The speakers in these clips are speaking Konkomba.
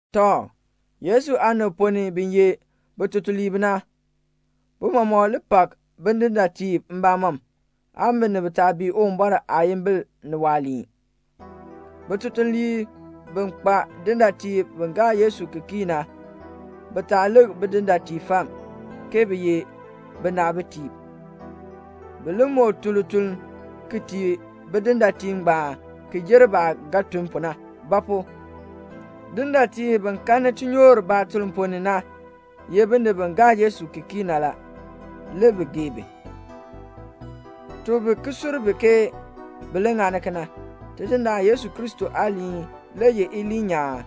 Tɔ, Yesu aanib ponn ni bi ye bitutuliib na, bi mɔmɔk li pak bidindaatiib mbamɔm, aan binib taa bii Uwumbɔr aayimbil ni waaliin. Bitutuliib bi kpa dindaatiib bi gaa Yesu ki kii na, bi taa lik bidindaatiib fam, ke bi ye binaabitiib. Bi li moo tun lituln ki tii bidindaatiib ngbaan ki jer baah ba ga tun pu na; ba pu? dindaatiib bi kanni tinyoor baatuln ponn ni na ye binib bi gaa Yesu ki kii na la, le bi gee bi. Tuk bi ki sur bi ke bi li ŋani kena. Tidindaan Yesu Kristo aaliin le ye iliin nyaan,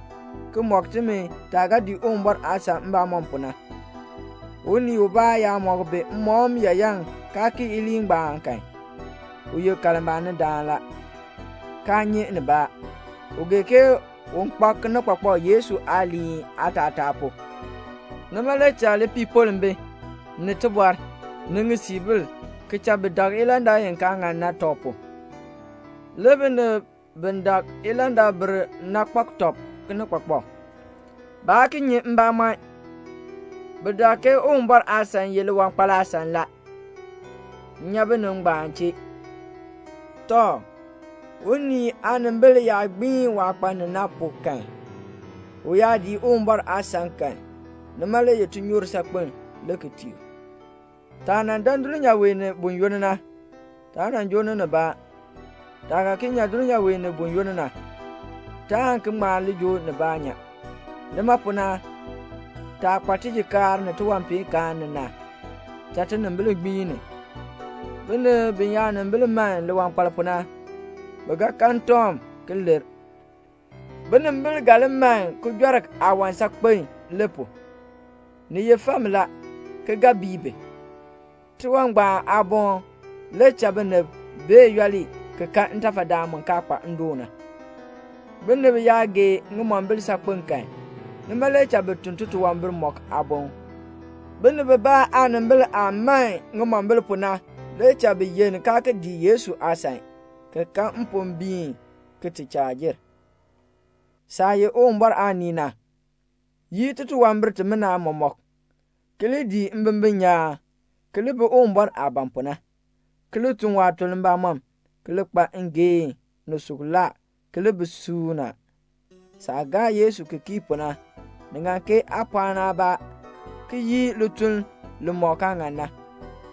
ki mɔk timi taah ga dii Uwumbɔr aasan mbamɔm pu na. Unii ubaa yaa mɔk bi mmɔkm yaayan kaa kii iliin ngbaan kan, u ye kalmbaanidaan la, kaa nyi nibaa. U gee ke un kpak kinikpakpak Yesu aaliin aatataa pu. Nima le cha lipiipoln bi, ni tibɔr, ni ŋisiibil, ki cha bi dak ilandak i kaa ŋan na tɔb pu. Le binib bi dak ilandakbir na kpak tɔb kinikpakpak. Baa ki nyi mbamɔn. Bi dak ke Uwumbɔr aasan ye liwankpal aasan la. [Nya binib ngbaan chee.] Tɔ, unii aanimbil yaa gbiin waah kpa ni na pu kan, u yaa dii Uwumbɔr aasan kan, nima le ye tinyoor saakpen le ki tii u. Taah nan dan dulnyaa wee ni buyoonn na, taa nan joo ni nibaa. Taah ga ki nyan dulnyaa wee ni buyoonn na, taan ki ŋma li joo nibaa nyan. Nima pu na, taah kpa tijikaar ni tiwanpeenkaan ni na, cha tinimbil gbiin ni. Binib biyaanimbil man liwankpal pu na, bi ga kan ntɔŋ, ki lir. Binimbil ga li man kijɔrk aawan saakpen le pu. Ni ye fam la, ki ga bii bi. Tiwan ngbaan aaboln le cha binib bee yooli ki kan ntafadaan mu kaa kpa ndoon na. Binib yaa gee ŋimombil saakpen kan, nima le cha bi tun titunwambir mɔk aaboŋ. Binib bibaa aanimbil aah man ŋimombil pu na le cha bi yenn kaa ki dii Yesu aasan, ki kan mpombiin ki ti chaa jer. Saah ye Uwumbɔr aanii na, yii titunwambir timina mɔmɔk, ki li dii mbimbin nyaan, ki li bi Uwumbɔr aah ban pu na, ki li tun waatuln mbamɔm, ki li kpa ngeehn, ni suklaa, ki li bi suuna. Saah gaa Yesu ki kii pu na, ni ŋan ke aa pɔɔni aabaa ki yii lituln limɔk kaa ŋan na,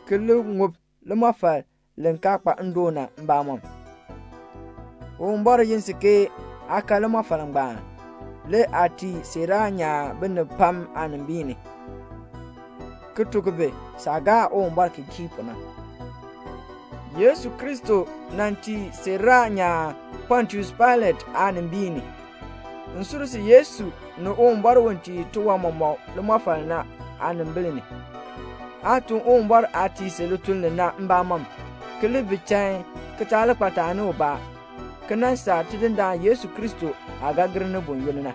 ki li ŋub limɔfal li kaa kpa ndoon na mbamɔm. Uwumbɔr yin si ke aa kan limɔfal ngbaan, le aa tii siiraa nyaan binib pam aanimbil ni, ki tuk bi saah gaa Uwumbɔr ki kii pu na. Yesu Kristo nan tii siiraa nyaan Pontius Pailat aanimbiin ni. M sur si Yesu ni Uwumbɔr u tii tiwan mɔmɔk limɔfal na aanimbil ni, aa tun Uwumbɔr aah tii si lituln li na mbamɔm, ki li bi chain, ki taa li kpa taani ubaa, ki nan saa Tidindaan Yesu Kristo aah ga gir ni buyoonn na.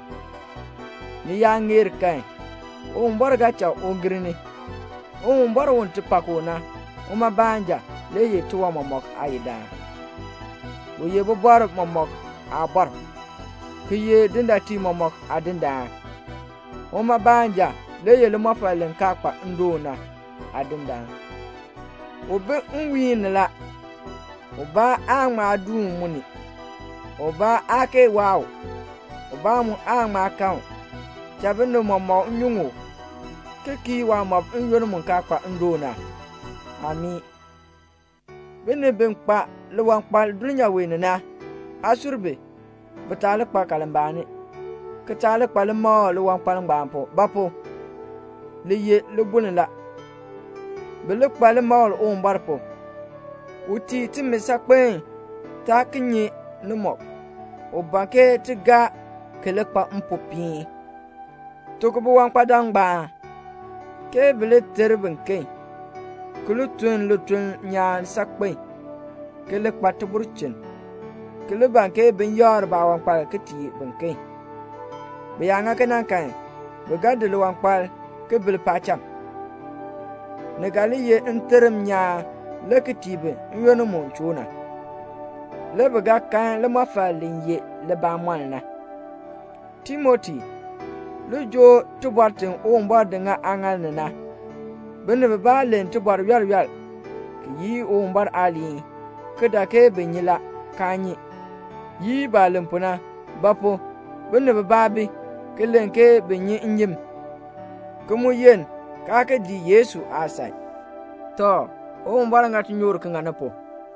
Ni yaa ŋeer kan, Uwumbɔr ga cha u gir ni. Uwumbɔr u ti pak u na, uma baanja le ye tiwan mɔmɔk Aayidaan. U ye bibɔrb mɔmɔk Aabɔr, ki ye dindaatiib mɔmɔk Aadindaan. Uma baanja le ye limɔfal li kaa kpa ndoon na Aadindaan. U bi nwiihn ni la. Ubaa aan ŋma duun mu ni. Ubaa aa kee waa u. Ubaa mu aan ŋma kan u. Cha binib mɔmɔk nyuŋ u, ki kii waamɔb n-yoonn mu kaa kpa ndoon na. Amii. Binib bi kpa liwankpal dulnyaa wee ni na, aa sur bi, bi taa li kpa kalmbaani, ki taa li kpa limakl liwankpal ngbaan pu. Ba pu? li ye libuln la. Bi li kpa limakl Uwumbɔr pu. U tii timi saakpen taa ti ki nyi ni mɔk, u ban ke ti gaa, ki li kpa mpopiin. Tuk biwankpadam ngbaan ke bi li ter biken, ki li tun lituln nyaan saakpen, ki li kpa tibulchin, ki li ban ke bin yakr baawankpal ki tii biken. Bi yaa ŋa kena kan bi ga di liwankpal ki bil paacham. Ni ga li ye nterm nyaan ki tii bi n-yoonn mu choo na, le bi ga kan limɔfal li ye libamɔln na. Timoti, li joo tibɔr ti Uwumbɔr di ŋa aaŋaal ni na. Binib bibaa len tibɔr yool yool, ki yii Uwumbɔr aaliin, ki dak ke bi nyi la, kaa nyi. Yii baah len pu na. Ba pu? binib bibaa bi, ki len ke bi nyi nnyim, ki mu yenn kaa ki dii Yesu aasan. Tɔ, Uwumbɔr ŋa tinyoor ki ŋa ni pu.